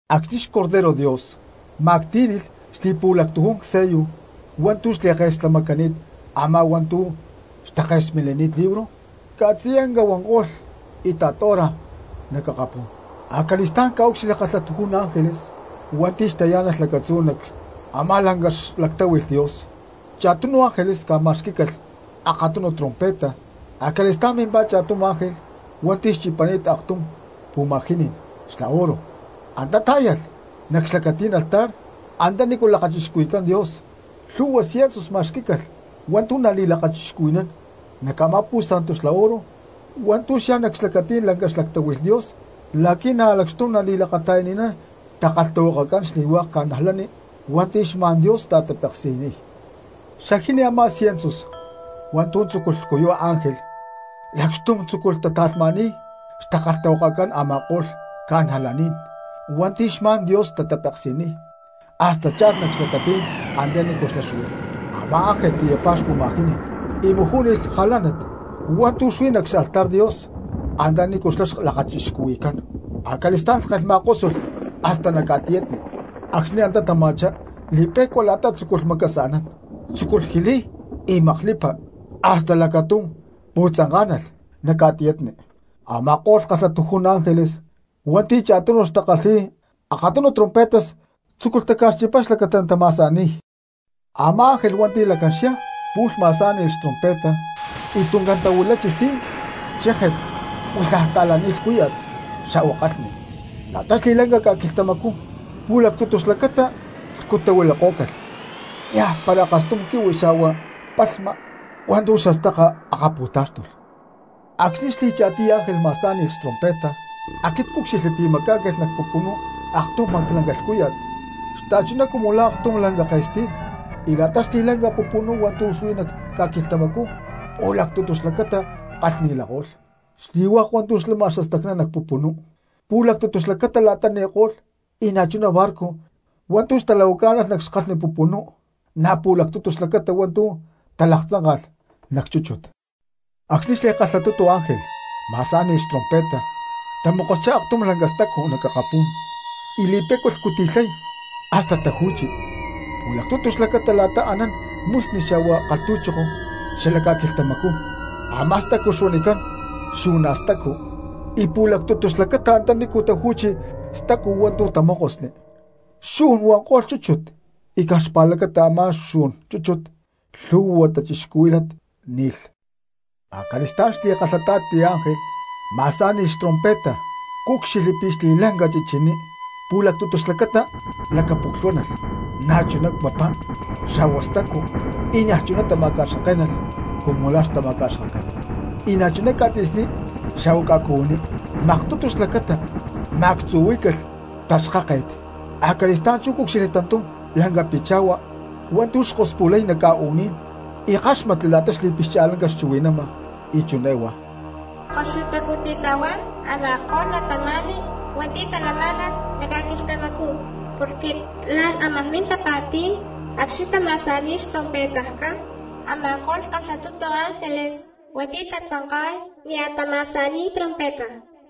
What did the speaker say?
Acxni̠ xBorrego Dios ma̠ctí̠nilh xli̠pu̠lactujún sello hua̠ntu̠ xli̠ke̠slamacani̠t a̠má hua̠ntu̠ caj xtake̠smilini̠t libro, ca̠tziyanca huanko̠lh íta̠t hora nac akapú̠n. Acali̠stá̠n cca̠ucxilhli kalhatujún ángeles hua̠nti̠ xtayá̠nalh lacatzú nac a̠má lanca xlactáhui̠lh Dios, cha̠tunu ángeles ca̠ma̠xquí̠calh akatunu trompeta. Acali̠stá̠n mimpá cha̠tum ángel hua̠nti̠ xchipani̠t aktum pu̠ma̠jiní̠n xla oro y antá tá̠yalh nac xlacatí̠n altar antanícu lakachixcuhui̠cán Dios, lhu̠hua siensus ma̠xquí̠calh hua̠ntu̠ nali̠lakachixcuhui̠nán nac a̠má pu̠santu xla oro hua̠ntu̠ xyá nac xlacatí̠n lanca xlactáhui̠lh Dios, la̠qui̠ na̠ lacxtum nali̠lakata̠yani̠nán xtakalhtahuakacán xli̠hua̠k cristianos hua̠nti̠ xma̠n Dios tatapeksi̠niy. Xajini a̠má siensus hua̠ntu̠ tzúculh lhcuyuy ángel lacxtum tzúculh ta̠tata̠lhma̠ni̠y xtakalhtahuakacán a̠ma̠ko̠lh cristianos hua̠nti̠ xma̠n Dios tatapeksi̠niy hasta cha̠lh nac xlacatí̠n antanícu xlá huí. Amá ángel tiyapá pu̠ma̠jiní̠n y majú̠nilh jalánat hua̠ntu̠ xuí nac xaltar Dios antanícu xlá lakachixcuhui̠cán. Acali̠stá̠n lhkén ma̠kósulh hasta nac ca̠tiyatni. Acxni̠ antá tama̠chá li̠pe̠cua la̠ta tzu̠culh macaacsa̠nán, tzúculh jiliy y maklipa, hasta lacatum pu̠tzanká̠nalh lacatum nac ca̠tiyatni. Ama̠ko̠lh kalhatujún ángeles hua̠nti̠ cha̠tunu xtakalhi̠y akatunu trompetas tzúculh taca̠xchipay xlacata natama̠sa̠ni̠y. Amá ángelh hua̠nti̠ lacán xyá pu̠lh ma̠sá̠ni̠lh xtrompeta, y tuncán tahuilachi si̠n, chéje̠t, huilhaj xta̠lani̠t lhcúya̠t xa̠hua kalhni. La̠ta xli̠lanca ca̠quilhtamacú pu̠lactutu xlacata lhcutahuilakó̠calh, niajpara akastum quihui xa̠hua li̠cúxtut hua̠ntu̠ xastaka akatá̠xtulh. Acxni̠ xli̠cha̠tiy ángel ma̠sá̠ni̠lh xtrompeta, aquit cúcxilhli pi̠ macá̠ncalh nac pupunú aktum maclanca lhcúya̠t xta̠chuná cumu aktum lanca ke̠stí̠n, y la̠ta xli̠lanca pupunú hua̠ntu̠ huí nac ca̠quilhtamacú pu̠lactutu xlacata kalhni huanko̠lh. Xli̠hua̠k hua̠ntu̠ xlama xastacná nac pupunú, pu̠lactutu xlacata la̠ta ni̠ko̠lh y na̠chuná barco hua̠ntu̠ xtalahuacánalh nac xkalhni pupunú na̠ pu̠lactutu xlacata hua̠ntu̠ talaktzánka̠lh nac chúchut. Acxni̠ xli̠kalhatutu ángel ma̠sá̠ni̠lh xtrompeta, tamokoschá aktum lanca stacu nac akapú̠n y li̠pe̠cua clhcuti̠lhay hasta taju̠chi nac pu̠lactutu xlacata la̠ta anán musni xa̠hua kalhtu̠choko xala ca̠quilhtamacú. Ama̠ stacu xuanicán Xu̠na̠stacu, y pu̠lactutu xlacata antanícu taju̠chi stacu hua̠ntu̠ tamókosli, xu̠n huanko̠lh chúchut, y caj xpa̠lacata a̠má xu̠n chúchut lhu̠hua cristianos ni̠lh. Acali̠stá̠n xli̠kalhata̠ti ángel ma̠sá̠ni̠lh xtrompeta, cúcxilhli pi̠ la̠ta xli̠lanca chichiní pu̠lactutu xlacata lakapoklhuánalh, na̠chuná papá xa̠hua stacu, y niaj chuná tamacaxkaké̠nalh cumu la̠ xtamacaxkake̠nán, y na̠chuná ca̠tzi̠sní xa̠huá ca̠cuhuiní maktutu xlacata ma̠actzuhuí̠calh xtaxkáke̠t. Acali̠stá̠n chú cúcxilhli tantum lanca picha̠hua hua̠ntu̠ xkospu̠lay nac ca̠u̠ní̠n y ckáxmatli la̠ta xli̠pixcha̠lanca xchuhui̠nama y chiné huá: —¡Koxutacú titahuán a̠ma̠ko̠lh cristianos hua̠nti̠ talamá̠nalh nac ca̠quilhtamacú! Porque la̠n ámaj min tapa̠tí̠n acxni̠ natama̠sa̠ni̠y xtrompetajcán a̠ma̠ko̠lh kalhatutu ángeles hua̠nti̠ tatzanka̠y nia̠ tama̠sa̠ni̠y trompeta.